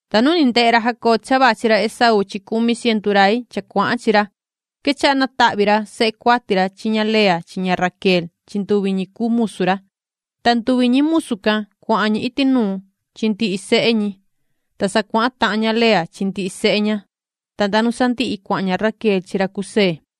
Ta nu ni ndehe ra Jacob cha vachi ra Esaú chi cumi cientu rai cha cuahan chi ra, quechaha natahvi ra sehe cuati ra chi ña Lea chi ña Raquel chi nduvi ñi cuu musu ra. Ta nduvi ñi musu can, cuahan ñi iti nuun chi ndihi sehe ñi, ta sa cuahan tahan ña Lea chi ndihi sehe ña, ta nda nu sandihi cuahan ña Raquel chi ra José.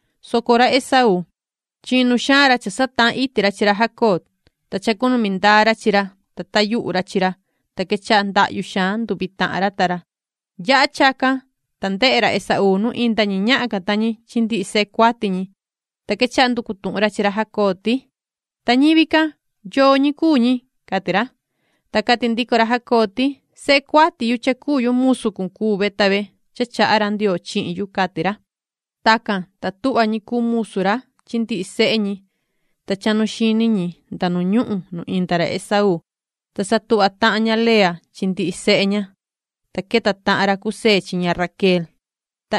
soco ra Esaú, chinu xaan ra cha satahan iti ra chi ra Jacob, ta chacunumi ndaa ra chi ra, ta tayuhu ra chi ra. Ta quechaha ndahyu xaan nduvi tahan ra ta ra. Yaha chacan, ta ndehe ra Esaú nu inda ñi ñahan can ta ñi chi ndihi sehe cuati ñi, ta quechaha nducu tuhun ra chi ra Jacob ti: ―Ta ñivi can, ¿yoo ñi cuu ñi? ―cati ra. Ta cati ndico ra Jacob ti: ―Sehe cuati ra musu cun cuu ve ta ve cha chaha ra Ndioo chihin yu ―cati ra. Tacan, ta tuhva ñi cuu musu ra chi ndihi sehe ñi, ta chahnu chiti ñi nu inda ra Esaú. Ta sa tuhva tahan ña Lea chi ndihi sehe ña ta chahnu chiti ñi, ta queta tahan ra José chi ña Raquel, ta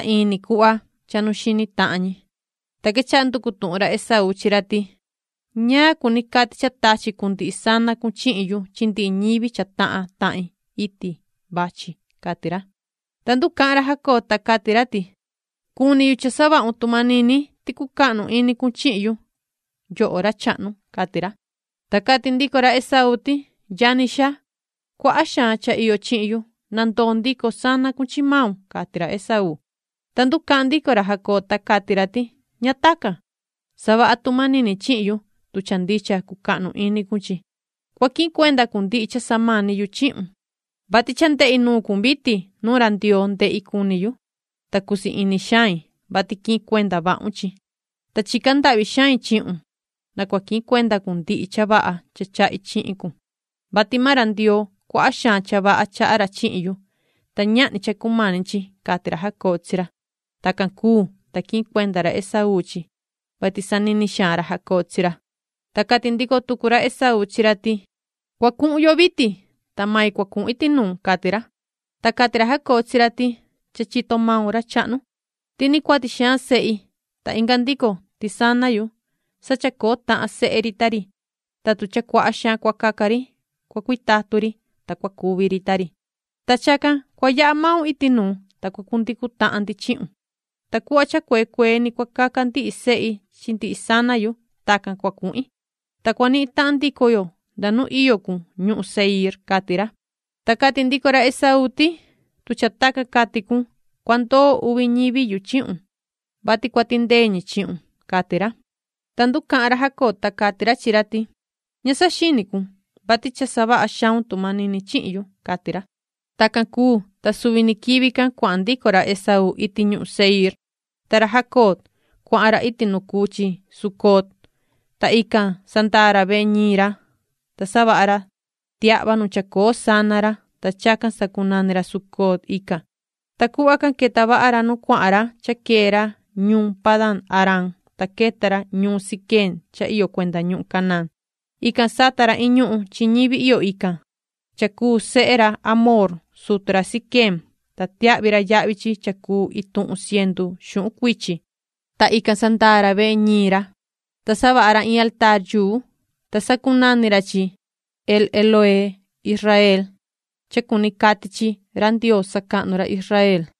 chahnu chiti tahan ñi. Ta quechaha nducu tuhun ra Esaú chi ra ti: ―¿Ñaan cuni cati cha tachi cun ndihi sana cun chihin yu chi ndihi ñivi cha tahan tahin iti vachi? ―cati ra. Ta nducahan ra Jacob, ta cati ra ti: ―Cuni yu cha savahun tu manini, cucahnu ini cun chihin yu, yoho ra chahnu ―cati ra. Ta cati ndico ra Esaú ti: ―Yani xaa, cuaha xaan cha iyo chihin yu, na ndoo ndico sana cun chi maun ―cati ra Esaú. Ta nducahan ndico ra Jacob, ta cati ra ti: ―¡Ña tacan! Savaha tu manini chihin yu, tu cha ndicha cucahnu ini cun chi, cua quihin cuenda cun ndihi cha samani yu chihun, vati cha ndehi nuun cun vitin. Nuu ra Ndioo ndehi cuni yu, ta cusii ini xain, vati quihin cuenda vahun chi. Ta chica ndahvi xain chihun, na cua quihin cuenda cun ndihi cha vaha cha chahi chihin cun, vati maan ra Ndioo, cuaha xaan cha vaha chaha ra chihin yu, ta ñahni cha cumani chi ―cati ra Jacob chi ra. Tacan cuu, ta quihin cuenda ra Esaú chi, vati sanini xaan ra Jacob chi ra. Ta cati ndico tucu ra Esaú chi ra ti: ―Cua cuhun yo vitin, ta mai cua cuhun iti nuun ―cati ra. Ta cati ra Jacob chi ra ti: ―Cha chito maun, ra chahnu, ti ni cuati xaan sehi, ta inga ndico, ti mbee yu chi chivu yu chi sundiquin yu sa chacoo tahan sehe ri ta ri, ta tu cha cuaha xaan cua caca ri, cua cuitatun ri, ta cua cuvi ri ta ri. Ta chacan cua yaha maun iti nuu, ta cua cundicu tahan ndi chihun, ta cuhva cha cuee cuee ni cua caca ndihi sehi chi ndihi sana yu. Tacan cua cuhin, ta cua nihin tahan ndico yo nda nu iyo cun ñuhun Seiir ―cati ra. Ta cati ndico ra Esaú ti: ―Tu cha tacan cati cun, cua ndoo uvi ñivi yu chihun, vati cua tindee ñi chihun ―cati ra. Ta nducahan ra Jacob, ta cati ra chi ra ti: ―Ña saxini cun, vati cha savaha xaun tu manini chihin yu ―cati ra. Tacan cuu, ta suvi ni quivi can cuahan ndico ra Esaú iti ñuhun Seiir. Ta ra Jacob, cuahan ra iti nu cuu chi Sucot, ta ican sandaa ra vehe ñiin ra, ta savaha ra tiahva nu chacoo sana ra, ta chacan sacunani ra Sucot ican. Ta cuhva can queta vaha ra nu cuahan ra cha quee ra ñuun Padan-aram, ta queta ra ñuun Siquem cha iyo cuenda ñuhun Canaán. Ican sata ra iin ñuhun chi ñivi iyo ican, cha cuu sehe ra Hamoor, sutu ra Siquem, ta tiahvi ra yahvi chi cha cuu ituhun cientu xuhun cuichi, ta ican sandaa ra vehe ñiin ra. Ta savaha ra in altaar, ta sacunani ra chi El-Elohee-Israel, cha cuni cati chi”Ra Ndioo sacahnu ra Israel”.